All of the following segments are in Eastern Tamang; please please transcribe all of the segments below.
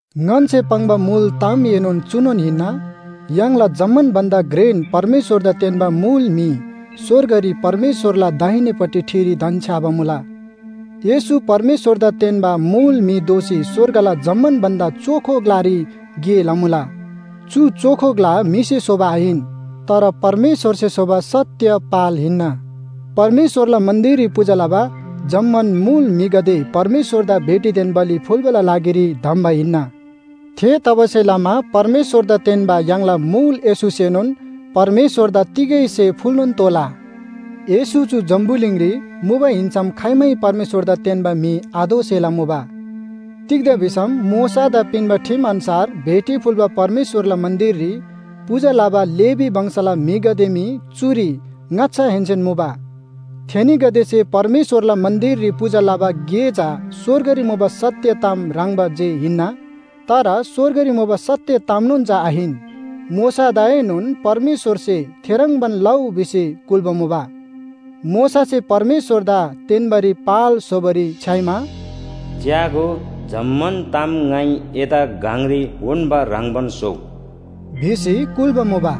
ङन्‍से पाङ्बा मुल तामएनोन चुनोन हिन्‍ना, य्‍हाङला जम्‍मान भन्‍दा घ्रेन परमेश्‍वरदा तेन्‍बा मुल म्‍हि स्‍वर्गरी परमेश्‍वरला दाहिनेपट्टि ठिरी धन्‍छ्‌याबा मुला। येशू परमेश्‍वरदा तेन्‍बा मुल म्‍हि दोसी स्‍वर्गला जम्‍मान भन्‍दा चोखो ग्‍लारी गे लमुला। चु चोखो ग्‍ला म्‍हिसे स्‍होबा आहिन, तर परमेश्‍वरसे स्‍होबा सत्‍य पाल हिन्‍ना। परमेश्‍वरला मन्‍दिररी पूजा लबा जम्‍मान मुल म्‍हिगदे परमेश्‍वरदा भेटीदेन बलि फुल्‍बाला लागिरी धम्‍बा हिन्‍ना। थेतबासेलमा परमेश्‍वरदा तेन्‍बा य्‍हाङला मुल येशूसेनोन परमेश्‍वरदा तिगै स्‍हे फुल्‍नोन तोःला। येशू चु जम्‍बुलिङरी मुबा हिन्‍सम खाइमै परमेश्‍वरदा तेन्‍बा म्‍हि आदोसेला मुबा। तिग्‍दा भिसम मोशादा पिन्‍बा ठिम अन्‍छार भेटी फुल्‍बा परमेश्‍वरला मन्‍दिररी पूजा लबा लेवी वंशला म्‍हिगदे मी चुरी ङाच्‍छाहेन्‍सेन मुबा। थेनीगदेसे परमेश्‍वरला मन्‍दिररी पूजा लबा गे चा स्‍वर्गरी मुबा सत्‍य ताम ह्रङ्‌बा जे हिन्‍ना, तर स्‍वर्गरी मुबा सत्‍य तामनोन चा आहिन। मोशादाएनोन परमेश्‍वरसे थेह्रङ्बान लउ भिसी कुल्‍बा मुबा। मोशासे परमेश्‍वरदा तेन्‍बारी पाल स्‍होबारी छ्‌याइमा, “च्‍यागो, जम्‍मान ताम ङाइ एदा गङरी उन्‍बा ह्रङ्‌बान स्‍होउ” भिसी कुल्‍बा मुबा।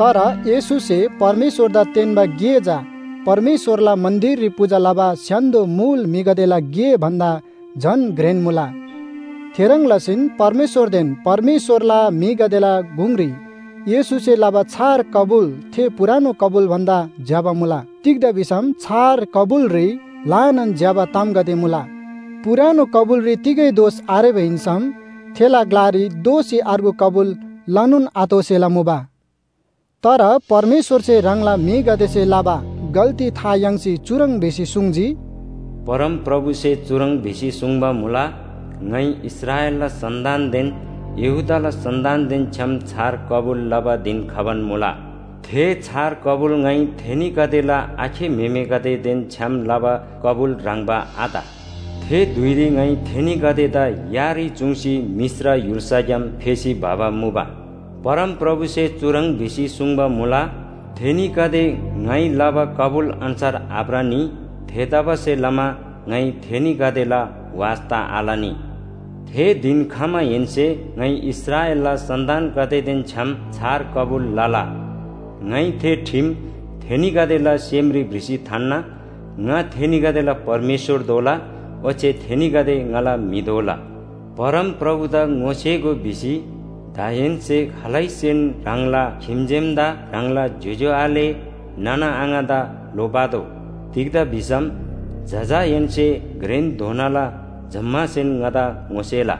तर येशूसे परमेश्‍वरदा तेन्‍बा गे चा परमेश्‍वरला मन्‍दिररी पूजा लबा स्‍य्‍हान्‍दो मुल म्‍हिगदेला गे भन्‍दा झन घ्रेन मुला। थेह्रङ् लसीन परमेश्‍वरदेन परमेश्‍वरला म्‍हिगदेला गुङरी येशूसे लबा छार कबुल थे पुरानो कबुल भन्‍दा ज्‍यबा मुला। तिग्‍दा भिसम छार कबुलरी ल्‍हानान ज्‍यबा तामगदे मुला। पुरानो कबुलरी तिगै दोष आरेबा हिन्‍सम थेला ग्‍लारी दोःसी अर्गु कबुल लनोन आतोःसेला मुबा। तर परमेश्‍वरसे ह्राङला म्‍हिगदेसे लबा गल्‍ती था याङ्सी चुह्रङ् भिसी सुङ्जी, “परमप्रभुसे चुह्रङ् भिसी सुङ्बा मुला, ङाइ इस्राएलला सन्‍तानदेन यहूदाला सन्‍तानदेन छ्‌याम छार कबुल लबा धिन खबान मुला। थे छार कबुल ङाइ थेनीगदेला आखे म्‍हेमेगदेदेन छ्‌याम लबा कबुल ह्रङ्‌बा आत। थे धुइरी ङाइ थेनीगदेदा यारी चुङ्सी मिश्र य्‍हुल्‍साग्‍याम फेसी भबा मुबा। परमप्रभुसे चुह्रङ् भिसी सुङ्बा मुला, थेनीगदे ङाइ लबा कबुल अन्‍छार आभ्रनी। थेतबासेलमा ङाइ थेनीगदेला वास्‍ता आलनी। थे धिन खमाहेन्‍से ङाइ इस्राएलला सन्‍तानगदेदेन छ्‌याम छार कबुल लला, ङाइ थे ठिम थेनीगदेला सेमरी भ्रिसी थान्‍ना। ङा थेनीगदेला परमेश्‍वर दोला ओच्‍छे थेनीगदे ङाला म्‍हि दोला। ‘परमप्रभुदा ङोसेगो’ भिसी दाहेन्‍से खालैसेन ह्राङला खिम्‍जेमदा, ह्राङला ज्‍योज्‍यो आले नाना आङादा लोप्‍आतोः। तिग्‍दा भिसम जजाहेन्‍से घ्रेनधोनाला जम्‍मासेन ङादा ङोसेला।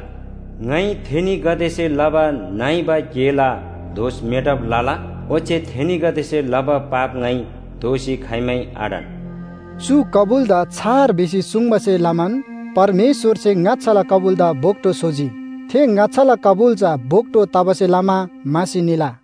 ङाइ थेनीगदेसे लबा नइबा गेला दोष मेटब लला, ओच्‍छे थेनीगदेसे लबा पाप ङाइ दोःसी खाइमै आढन।” चु कबुलदा “छार” भिसी सुङ्बासे लमान परमेश्‍वरसे ङाच्‍छाला कबुलदा भोक्‍टो स्‍होजी। थे ङाच्‍छाला कबुल चा भोक्‍टो तबासे लमा म्‍हासी निला।